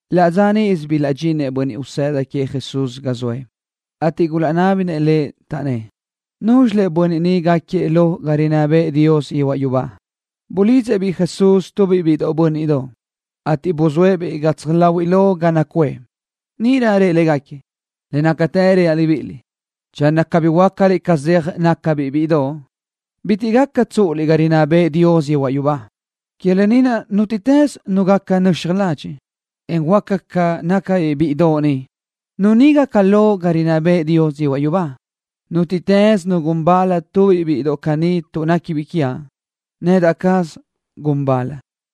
Laʼ dza níʼisö bilaʼdxinëʼ bönniʼ usëda queëʼ Jesús ga zoëʼ, ateʼ gulaʼnábinëʼ Lëʼ, taʼnnë́ʼ: —¿Núzxilëʼ bönniʼ ni gáquiëʼ lo ga rinná bëʼë Dios yehuaʼ yubá? Bulidzëʼ-biʼ Jesús tubiʼ biʼi bö́nniʼdoʼ, ateʼ buzóëʼ-biʼ gatsaj láhuiʼlö ga naʼ nacuʼë. Níʼirö rëʼ légaquiëʼ: —Le nácatë reaʼ libíʼiliʼ, channö cabí huöácaliʼ ca zeaj nácabiʼ bíʼidoʼ, bitiʼ caʼ tsúʼuliʼ ga niʼ rinná bëʼë Dios yehuaʼ yubá. Que lë ni naʼ, nútiʼtës nu gaca nöxaj ladxiʼ, en huöáca ca nácabiʼ bíʼidoʼ ni, nu ni gaca lo ga niʼ rinná bëʼë Dios yehuaʼ yubá. Nútiʼtës nu gun bal tubiʼ bíʼidoʼ caní tuʼ néquibiʼ quiaʼ, nedaʼ caz gun bal.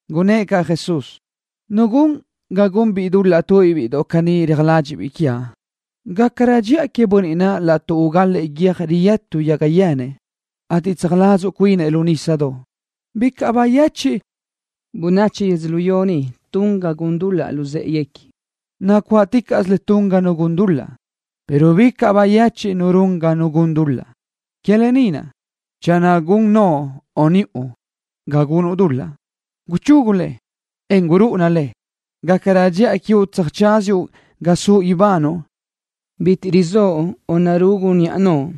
Gunnë́ʼ caʼ Jesús: —Nu gun ga gunbiʼ dul-laʼ tubiʼ bíʼidoʼ caní réajlëʼëbiʼ quiaʼ, gácarö dxiʼa queëʼ bönniʼ naʼ laʼtuʼ ugalëʼë guiö́j riyë́tuni yaga yenëʼ, ateʼ tsöjsuladzuʼ cuinëʼ lu nísadoʼ. Bicaʼ bayechiʼ bönachi yödzölió ni tun ga gun dul-laʼ luzë́ʼeguequi. Nacuáʼticaʼsö le tun ga nu gun dul-laʼ, pero bicaʼ bayechiʼ nu run ga nu gun dul-laʼ. ’Que lë ni naʼ, channö gun noʼo o niʼu ga gunuʼ dul-laʼ, guchugu le, en gurúʼuna le. Gácarö dxiʼa quiuʼ tsöjtsáziuʼ ga suʼ ibanuʼ bitiʼ rizóʼo o narugu niʼa noʼo,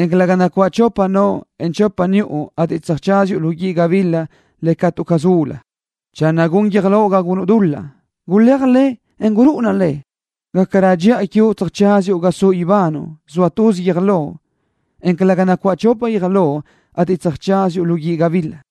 en calëga nacuáʼ chopa noʼo, en chopa niʼu ateʼ tsöjtsáziuʼ lu guíʼ gabila le catu caz ulu. Channö gun guiö́j loʼ ga gunuʼ dul-laʼ, guléaj le, en gurúʼuna le. Gácarö dxiʼa quiuʼ tsöjtsáziuʼ ga suʼ ibanuʼ, zoa tuz guiö́j loʼ, en calëga nacuáʼ chopa guiö́j loʼ, ateʼ tsöjtsáziuʼ lu guíʼ gabila.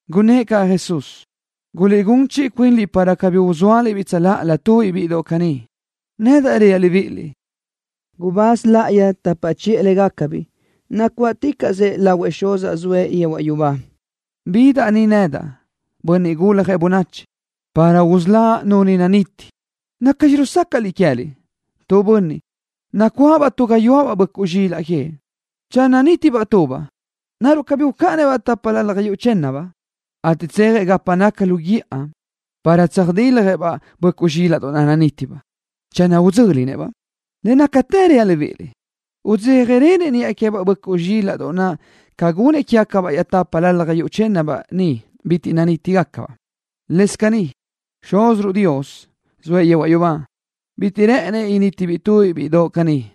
Gunnë́ʼ caʼ Jesús: —Guliʼgún chiʼi cuinliʼ para cabí uzóaliʼ-biʼ tsöláʼalö tubiʼ bíʼidoʼ caní. Nedaʼ reaʼ libíʼiliʼ, gubáz láʼayi tapa chiʼë légacabiʼ nacuáʼticaʼsëʼ lahuëʼ Xuzaʼ zoëʼ yehuaʼ yubá. Bidaʼ ni nedaʼ, Bönniʼ Guljëʼ Bönachi, para usöláʼ nu ni naniti. ’¿Nacxi rusácaʼliʼ queë́liʼ? Tu bönniʼ, nacuáʼabaʼ tu gayuáʼ böʼcuʼ zxilaʼ queëʼ, channö nítibaʼ tubaʼ, ¿naruʼ cabí ucáʼanëʼ-baʼ tápalalaj yuʼ chë́nnabaʼ naʼ, ateʼ tsejëʼ gapa naca lu guíʼa, para tsöjtiljëʼ-baʼ böʼcuʼ zxílaʼdoʼ naʼ nanítibaʼ? Channö udzö́linëʼ-baʼ, le nácatë reaʼ libíʼiliʼ, udzéjarönëʼ niʼa queë́baʼ böʼcuʼ zxílaʼdoʼ naʼ ca gunëʼ quégacabaʼ iaʼtápalalaj yuʼ chë́nnabaʼ niʼ bitiʼ gulaʼnítibaʼ. Lëscaʼ caní, Xúziruʼ Dios, zoëʼ yehuaʼ yubá, bitiʼ rë́ʼënëʼ nítibiʼ tubiʼ bíʼidoʼ caní.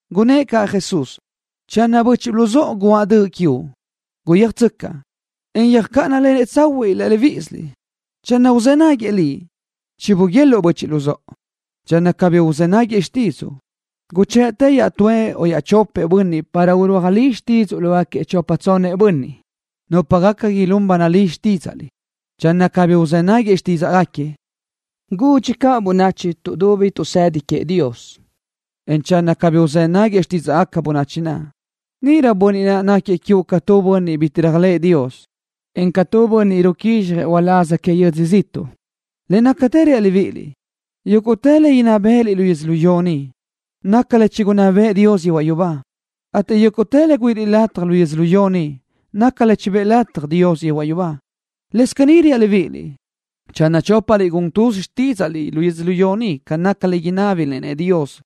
Gunnë́ʼ caʼ Jesús: —Channö böchiʼ luzóʼo guáʼ döʼ quiuʼ, guyéajtsöcaʼ, en yöjcáʼanalenëʼ tsahuiʼ laʼ libíʼisiliʼ. Channö uzë́ náguiëʼ liʼ, chibuguéluʼu böchiʼ luzóʼo. Channö cabí uzë́ náguiëʼ xtídzuʼu, guchë́ʼë iaʼtúëʼ o iaʼchopëʼ bönniʼ para urúaj li xtídzuʼu lógaquiëʼ chopa tsonnëʼ bönniʼ, nupa gaca ilún ba nalí que xtídzaʼliʼ. Channö cabí uzë́ náguiëʼ xtídzaʼgaquiëʼ, gudxi caʼ bönachi tuʼdubi tuʼsëdi queëʼ Dios, en channö cabí uzë́ náguiëʼ xtídzaʼgaca bönachi naʼ, níʼirö bönniʼ naʼ gáquiëʼ quiuʼ ca tu bönniʼ bitiʼ réajlëʼë Dios, en ca tu bönniʼ ruquízxjëʼ uláz que yödzö ziʼtuʼ. ’Le nácatë reaʼ libíʼiliʼ, yúguʼtë le inná bë́ʼëliʼ lu yödzölió ni, naca le chigunná bëʼë Dios yehuaʼ yubá, ateʼ yúguʼtë le güíʼiliʼ lataj lu yödzölió ni, naca le chibë́ʼë lataj Dios yehuaʼ yubá. ’Lëscaʼ caní reaʼ libíʼiliʼ, channö chópasiliʼ gun tuz xtídzaʼliʼ lu yödzölió ni ca naca tu le inábiliʼ-nëʼ Dios,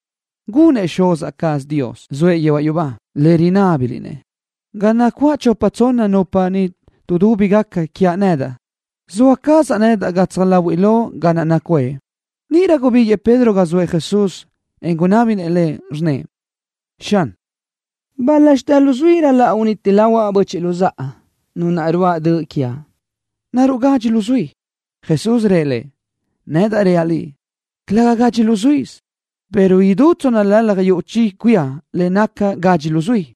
gunëʼ Xuz cazaʼ Dios, zoëʼ yehuaʼ yubá, lë naʼ rinábiliʼ-nëʼ. Ga nacuáʼ chopa tsonna nupa ni nudúbigaca quiaʼ nedaʼ, zoa cazaʼ nedaʼ gatsaj láhuiʼlö ga naʼ nacuʼë. Níʼirö gubíguiʼë Pedro ga zoëʼ Jesús, en gunábinëʼ Lëʼ, rnnëʼ: —Xan, ¿bál-laxitë luzuí ral-laʼ uniti lahuaʼ böchiʼ luzáʼa, nu naʼ ruáʼ döʼ quiaʼ? ¿Naruʼ gadxi luzuí? Jesús rëʼ lëʼ: —Nedaʼ reaʼ liʼ, calë́gasö gadxi luzuí, pero idú tsónnalalaj yuʼ chi cuía le naca gadxi luzuí.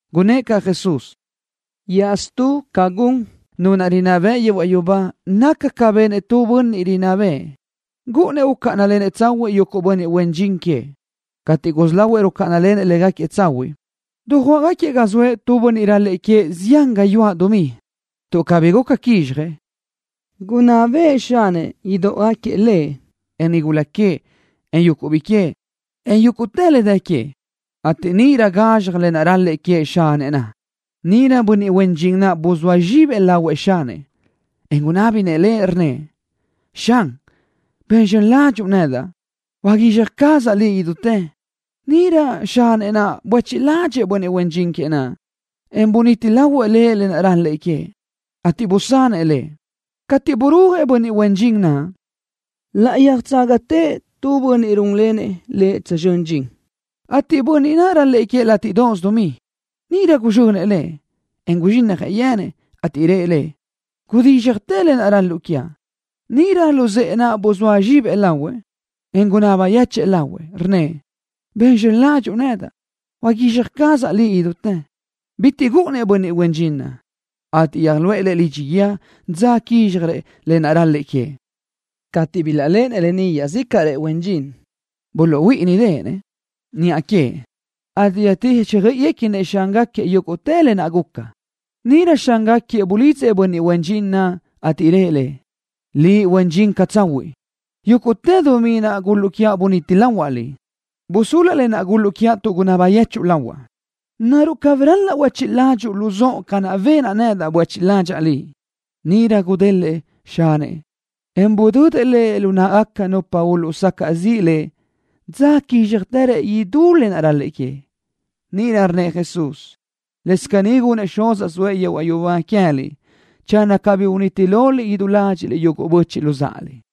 Gunnë́ʼ caʼ Jesús: —Iaʼstú, ca gun Nu naʼ rinná bëʼ yehuaʼ yubá naca ca benëʼ tu bönniʼ rinná bëʼë. Gúʼunnëʼ ucáʼanalenëʼ tsahuiʼ yuguʼ bönniʼ huen dxin queëʼ. Cateʼ gusí lahuëʼ rucáʼanalenëʼ légaquiëʼ tsahuiʼ, dujuáʼgaquiëʼ ga zoëʼ tu bönniʼ ral-lëʼë queëʼ zián gayuáʼ dumí. Tuʼ cabí guca quizxjëʼ, gunná bëʼë xanëʼ idóʼogaquiëʼ lëʼ, en nigula queëʼ, en yuguʼ biʼi queëʼ, en yúguʼtë le dë queëʼ, ateʼ níʼirö gazxaj le ral-lëʼë queëʼ xanëʼ naʼ. Níʼirö bönniʼ huen dxin naʼ buzóa zxibëʼ lahuëʼ xanëʼ, en gunábinëʼ lëʼ, rnnëʼ: “Xan, ben zxön ládxuʼu nedaʼ. Huaguizxaj cazaʼ liʼ idutë.” Níʼirö xanëʼ naʼ buéchiʼ ládxëʼë bönniʼ huen dxin queëʼ naʼ, en buniti lahuëʼ lëʼ lë naʼ ral-lëʼë queëʼ, ateʼ busanëʼ lëʼ. Cateʼ burúajëʼ bönniʼ huen dxin naʼ, laʼ yöjtságatëʼ tu bönniʼ rúnlenëʼ lëʼ tsözxö́n dxin, ateʼ bönniʼ naʼ ral-lëʼë queëʼ látiʼdoʼos dumí. Níʼirö guzxönëʼ lëʼ, en guzxínnajëʼ yenëʼ, ateʼ rëʼ lëʼ: “Gudízxjatë lë naʼ ral-luʼu quiaʼ.” Níʼirö luzë́ʼë naʼ buzóa zxibëʼ lahuëʼ, en gunaba yechë́ʼë lahuëʼ, rnnëʼ: “Ben zxön ládxuʼu nedaʼ. Huaguizxaj cazaʼ liʼ idutë.” Bitiʼ gúʼunnëʼ bönniʼ huen dxin naʼ, ateʼ yöjluʼë lëʼ lidxi guíë dza quízxjarëʼ lë naʼ ral-lëʼë queëʼ. Cateʼ bilaʼléʼenëʼ lë ni iaʼzícaʼrëʼ huen dxin, buluʼhuíʼinideʼenëʼ niʼa queëʼ, ateʼ yöjtíxjöiʼiguequinëʼ xángaquiëʼ yúguʼtë lë naʼ guca. Níʼirö xángaquiëʼ bulidzëʼ bönniʼ huen dxin naʼ, ateʼ rëʼ lëʼ: “Liʼ, huen dxin catsahuiʼ. Yúguʼtë dumí naʼ gúl-luʼu quiaʼ buniti lahuaʼ liʼ. Busúluaʼ lë naʼ gúl-luʼu quiaʼ tuʼ gunaba yechuʼu lahuaʼ. ¿Naruʼ cabí ral-laʼ huéchiʼ ládxuʼu caʼ luzóʼo ca naʼ benaʼ nedaʼ, buéchiʼ ládxaʼa liʼ?” Níʼirö gulédeʼenëʼ xanëʼ, en budödëʼ lëʼ lu náʼagaca nupa uluʼsacaʼ ziʼ lëʼ dza quízxjarëʼ idútë le ral-lëʼë queëʼ. Níʼirö rnnëʼ Jesús: —Lëscaʼ caní gunëʼ Xuzaʼ zoëʼ yehuaʼ yubá queë́liʼ channö cabí uniti loliʼ idú ládxiʼliʼ yuguʼ böchiʼ luzáʼaliʼ.